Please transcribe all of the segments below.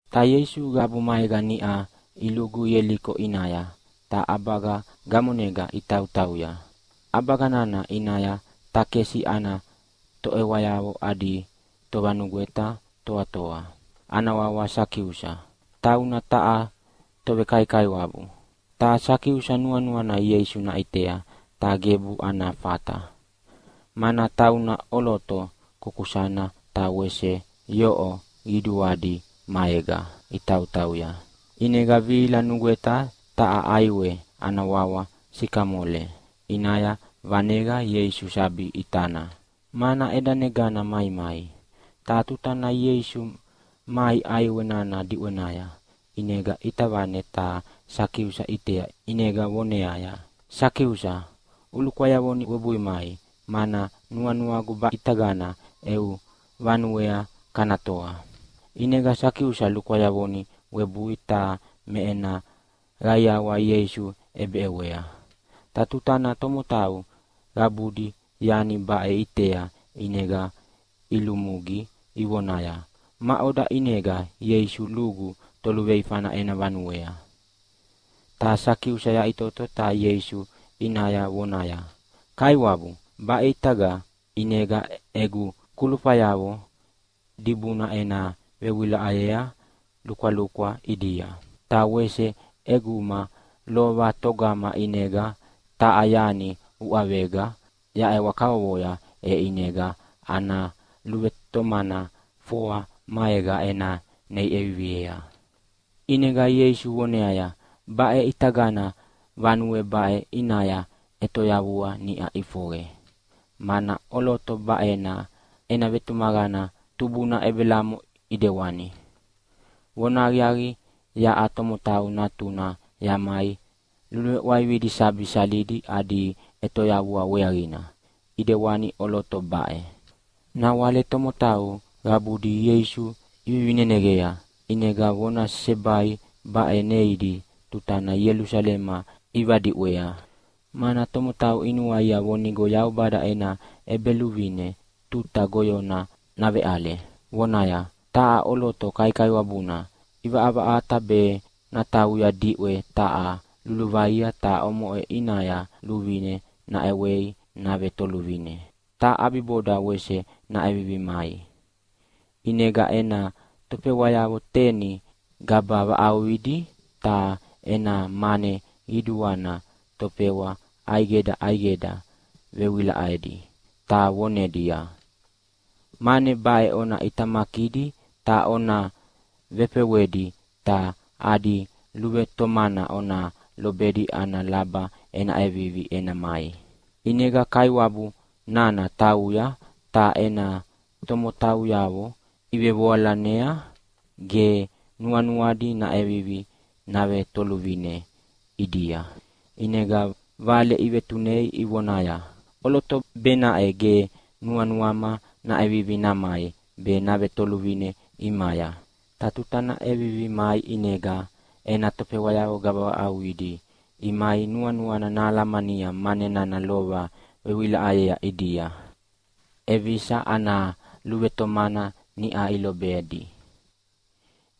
Ta Ieisu qabu maega niʼa ilugu Ieliko ʼinaya ta ʼabaga gamonega itautauya. ʼAbaga nana ʼinaya takesi ana toʼewayavo adi tovanugweta toatoa, ana wawa Sakiusa, tauna taha tovekaikaiwabu. Ta Sakiusa nuanuana Ieisu naʼitea ta gebu ana fata, mana tauna ʼoloto kukusana ta wese yoʼo qiduadi maega itautauya. ʼInega vihila nugweta taha ʼaiwe ana wawa sikamole ʼinaya vaneqa Ieisu sabi ʼitana, mana ʼedanegana maimai. Ta tutana Ieisu mai ʼaiwe nana diʼwenaya ʼinega ʼita vane ta Sakiusa ʼitea ʼinega voneaya, “Sakiusa, ulukwayavoni uwebui mai, mana nuanuagu baʼitagana eu vanuea kana toa.” ʼInega Sakiusa lukwayavoni webui ta me ena qaiawa Ieisu ʼebeʼewea. Ta tutana tomotau qabudi yani baʼe iʼitea ʼinega ilumugi ivonaya, “Maʼoda ʼinega Ieisu lugu toluveifana ena vanuea?” Ta Sakiusa yaʼitoto ta Ieisu ʼinaya vonaya, “Kaiwabu, baʼitaga ʼinega egu kulufayavo dibuna ena vewilaʼayea lukwalukwa ʼidia. Ta wese ʼeguma lova togama ʼinega taha yani uʼavega yaʼewa kavovoya e ʼinega ana luvetomana foa maega ena nei ʼeviviea.” ʼInega Ieisu voneaya, “Baʼe ʼitagana vanue baʼe ʼinaya ʼetoyavua niʼa ʼifoqe, mana ʼoloto baʼe ena vetumaqana tubuna Ebelamo ʼidewana. Vonahaqiaqi, yaʼa Tomotau Natuna yamai luluveʼwaividi sabi salidi adi ʼetoyavua weaqina, ʼidewani ʼoloto baʼe.” Nawale tomotau qabudi Ieisu ivivineneqea. ʼInega vona sesebai baʼe neidi tutana Ielusalema ivadiʼwea, mana tomotau inuaia vonigo Yaubada ena ʼEbeluvine tuta goyona naveʼale. Vonaya, “Taha ʼoloto kaikaiwabuna ʼivaʼavaʼata be natauya diʼwe taha luluvaia, ta omoʼe ʼinaya luvine naʼewei navetoluvine, ta ʼabiboda wese naʼevivi namai. ʼInega ena tofewayavo teni gaba vaʼauqidi ta ena mane qiduana tofewa ʼaidega ʼaidega vevewilaʼedi ta vonedia, ‘Mane baʼe ona ʼitamakidi ta ona vefewedi ta adi luvetomana ona lobedi ana laba ena ʼevivi ena mai.’ “ʼInega kaiwabu nana tauya, ta ena tomotauyavo ivevoalanea, ge nuanuadi naʼevivi navetoluvine ʼidia, ʼinega vale ivetunei ivonaya, ‘ʼOloto benaʼe ge nuanuama naʼevivi namai be navetoluvine ʼimaya!’ “Ta tuta nana ʼevivi mai ʼinega ena tofewayavo gaba vaʼauqidi imai nuanuana nahalamania mane nana lova vewilaʼayea ʼidia ʼevisa ana luvetomana niʼa ilobedi.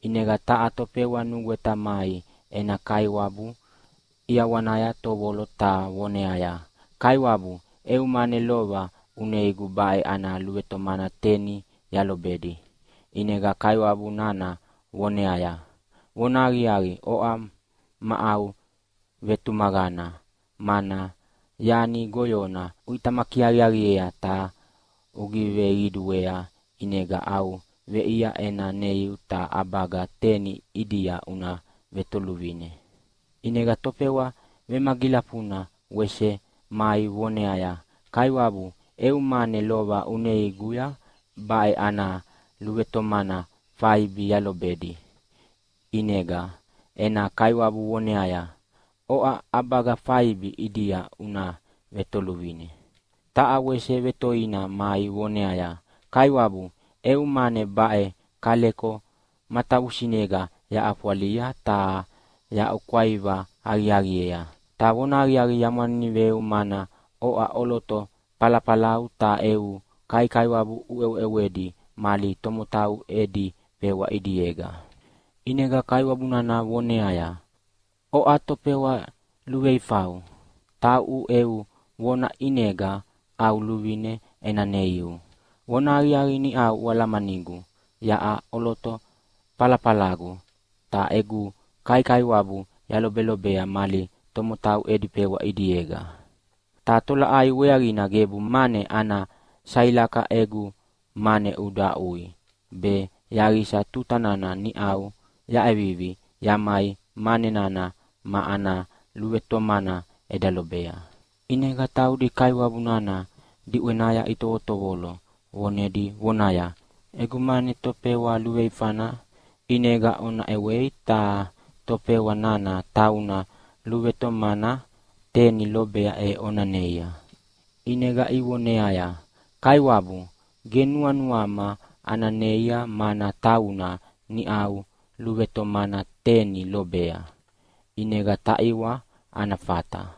ʼInega taha tofewa nugweta mai ena kaiwabu ʼiawanaya tovolo ta voneaya, ‘Kaiwabu, eu mane lova uneiguya baʼe ana luvetomana teni yalobedi.’ “ʼInega kaiwabu nana vonaya, ‘Vonahaqiaqi, oʼa ma au vetumaqana, mana yani goyona uʼitamaki aqiaqiea ta ugiveqiduea ʼinega au veʼia ena neiu ta ʼabaga teni ʼidia una vetoluvine.’ “ʼInega tofewa vemagilafuna wese mai voneaya, ‘Kaiwabu, eu mane lova uneiguya baʼe ana luvetomana faibi yalobedi.’ “ʼInega ena kaiwabu voneaya, ‘Oʼa ʼabaga faibi ʼidia una vetoluvine.’ “Ta wese vetoina mai voneaya, ‘Kaiwabu, eu mane baʼe kaleko matavusinega yaʼafwalia ta yahaʼukwaiva aqiaqiea. Ta vonahaqiaqi, yamwaniniveu mana oʼa ʼoloto falafalau ta eu kaikaiwabu uʼeweʼewedi mali tomotau edi fewa ʼidiega.’ “ʼInega kaiwabu nana voneaya, ‘Oʼa tofewa luveifau. Tauʼu eu vona ʼinega au luvine ena neiu. Vonahaqiaqi, niʼau ualamanigu yaʼa ʼoloto falafalagu, ta egu kaikaiwabu yalobelobea mali tomotau edi fewa ʼidiega. Ta tolaʼai weaqina gebu mane ana sailakaya egu mane uda aʼui, be yaqisa tuta nana niʼa yaʼevivi yamai mane nana ma ana luvetomana eda lobea?’ “ʼInega taudi kaiwabu nana diʼwenaya itovotovolo vonedi vonaya, ‘Egu mane tofewa luveifana ʼinega ona ʼewei ta tofewa nana tauna luvetomana teni lobea e ona neia.’ “ʼInega ivoneaya, ‘Kaiwabu, ge nuanuama ana neia mana tauna niʼau luvetomana teni lobea, ʼinega taʼiwa ana fata.’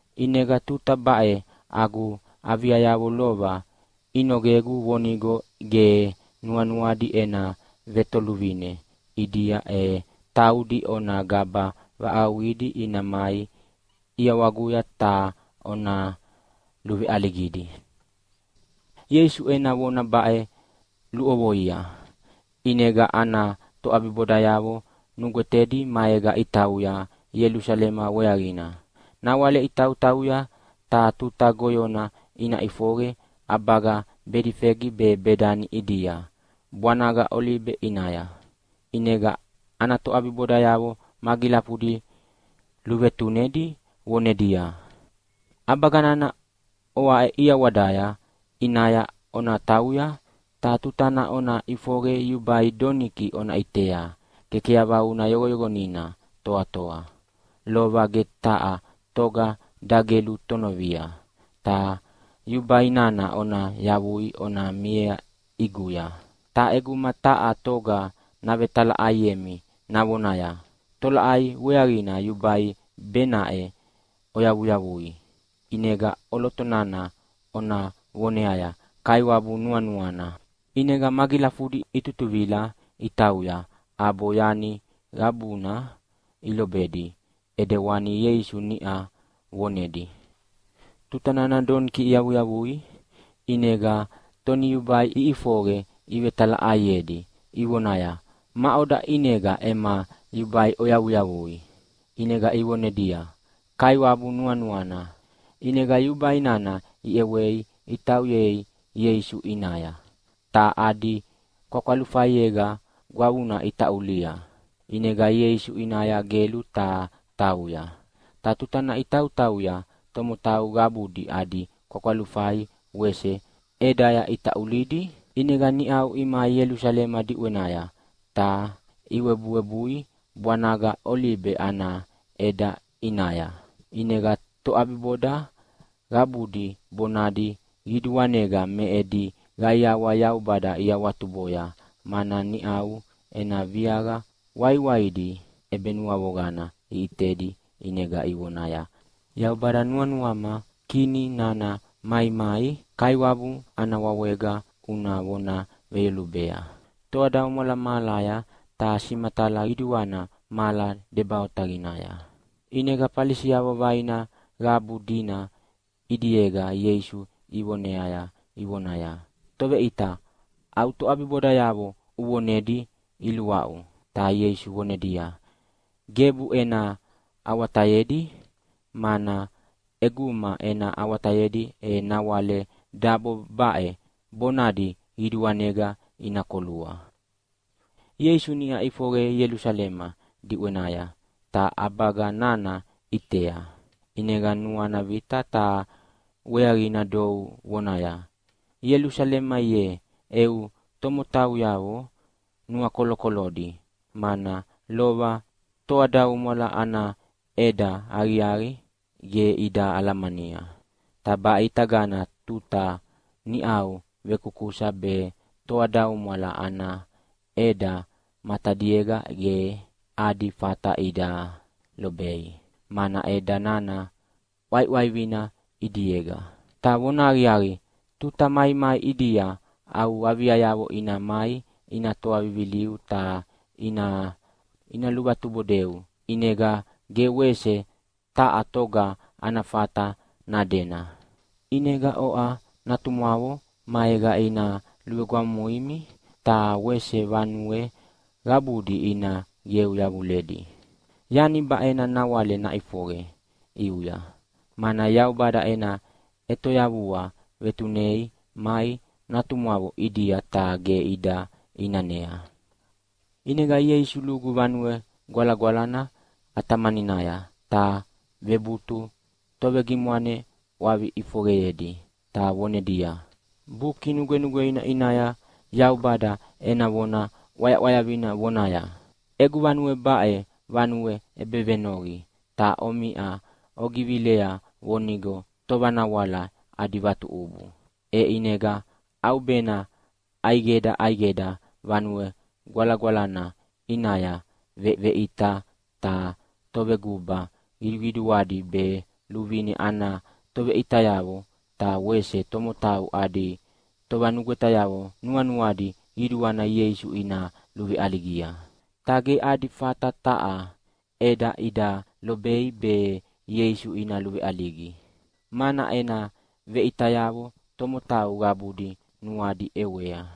ʼInega tuta baʼe agu aviayavo lova inogegu vonigo ge nuanuadi ena vetoluvine ʼidia e taudi ona gaba vaʼauqidi ina mai ʼiawaguya ta ona luveʼaligidi.’” Ieisu ena vona baʼe luʼovoia, ʼinega ana toʼabibodayavo nugwetedi maega itauya Ielusalema weaqina. Nawale itautauya ta tuta goyona ina ʼifoqe ʼabaga Bedifegi be Bedani ʼidia bwanaga Olibe ʼinaya. ʼInega ana toʼabibodayavo magilafudi luvetunedi vonedia, “ʼAbaga nana oaʼe ʼiawadaya ʼinaya ona tauya, ta tutana ona ʼifoqe yubai doniki ona ʼitea kekeyavauna yoqoyoqonina toatoa, lova ge taha toga dagelu tonovia, ta yubai nana ona yavui ona miea ʼiguya. Ta ʼeguma taha toga navetalaʼaiemi navonaya, ‘Tolaʼai weaqina yubai benaʼe oyavuyavui?’ ʼInega ʼoloto nana ona voneaya, ‘Kaiwabu nuanuana.’” ʼInega magilafudi itutuvila itauya ʼabo yani qabuna ilobedi ʼedewani Ieisu niʼa vonedi. Tutana doniki iyavuyavui ʼinega toniyubai iʼifoqe ivetalaʼaiedi ivonaya, “Maʼoda ʼinega ema yubai oyavuyavui?” ʼInega ivonedia, “Kaiwabu nuanuana.” ʼInega yubai nana iʼewei itauyea Ieisu ʼinaya, ta adi kwakwalufaiyega gwavuna itaʼulia, ʼinega Ieisu ʼinaya gelu ta tauya. Ta tutana itautauya tomotau qabudi adi kwakwalufai wese ʼedaya itaʼulidi. ʼInega niʼau imai Ielusalema diʼwenaya ta iwebuwebui bwanaga Olibe ana ʼeda ʼinaya, ʼinega toʼabiboda qabudi bonadi qiduanega me edi qaiawa Yaubada iawatuboya, mana niʼau ena viaqa waiwaidi ʼebenuavoqana iʼitedi ʼinega ivonaya, “Yaubada, nuanuama Kini nana maimai Kaiwabu ana wawega una vona veyolubea. Toadaumwala mahalaya ta simatala qiduana mahala deba otaqinaya!” ʼInega Falisiavo vaina qabu dina ʼidiega Ieisu ivonea ivonaya, “Toveʼita, au toʼabibodayavo uvonedi iluaʼu!” Ta Ieisu vonedia, “Gebu ena awatayedi, mana ʼeguma ena awatayedi e nawale dabo baʼe bonadi qiduanega ina kolua.” Ieisu niʼa ʼifoqe Ielusalema diʼwenaya ta ʼabaga nana ʼitea. ʼInega nuana vita ta weaqina dou vonaya, “Ielusalema ye, eu tomotauyavo nuakolokolodi. Mana lova toadaumwala ana ʼeda aqiaqi ge ida alamania. Ta baʼitagana tuta niʼau vekusakusa be toadaumwala ana ʼeda matadiega ge adi fata ida lobei, mana ʼeda nana ʼwaiʼwaivina ʼidiega. Ta vonahaqiaqi, tuta maimai ʼidia au aviayavo ina mai ina toa viviliu ta ina luvatubodeu, ʼinega ge wese taha toga ana fata nadena. ʼInega oʼa natumwavo maega ina luvegwamumuimi, ta wese vanue qabudi ina qeu yavuledi. Yani baʼena nawale naʼifoqe ʼiuya, mana Yaubada ena ʼetoyavua vetunei mai natumwavo ʼidia ta ge ida ʼinanea.” ʼInega Ieisu lugu Vanue Gwalagwalana ʼatamaninaya ta vebutu tovegimwane ʼwavi ʼifoqeyedi ta vonedia, “Buki Nugwenugweina ʼinaya Yaubada ena vona ʼwayaʼwayavina vonaya, ‘Egu vanue baʼe vanue ʼebevenoqi’, ta omiʼa ogivilea vonigo tovanawala adi vatuʼubu.” E ʼinega ʼaubena ʼaidega ʼaidega Vanue Gwalagwalana ʼinaya veveʼita, ta toveguba qiduqiduadi be luvine ana toveʼitayavo ta wese tomotau adi tovanugwetayavo nuanuadi qiduana Ieisu ina luveʼaligia. Ta ge adi fata taha ʼeda ida lobei be Ieisu ina luveʼaligi, mana ena veʼitayavo tomotau qabudi nuadi ʼewea.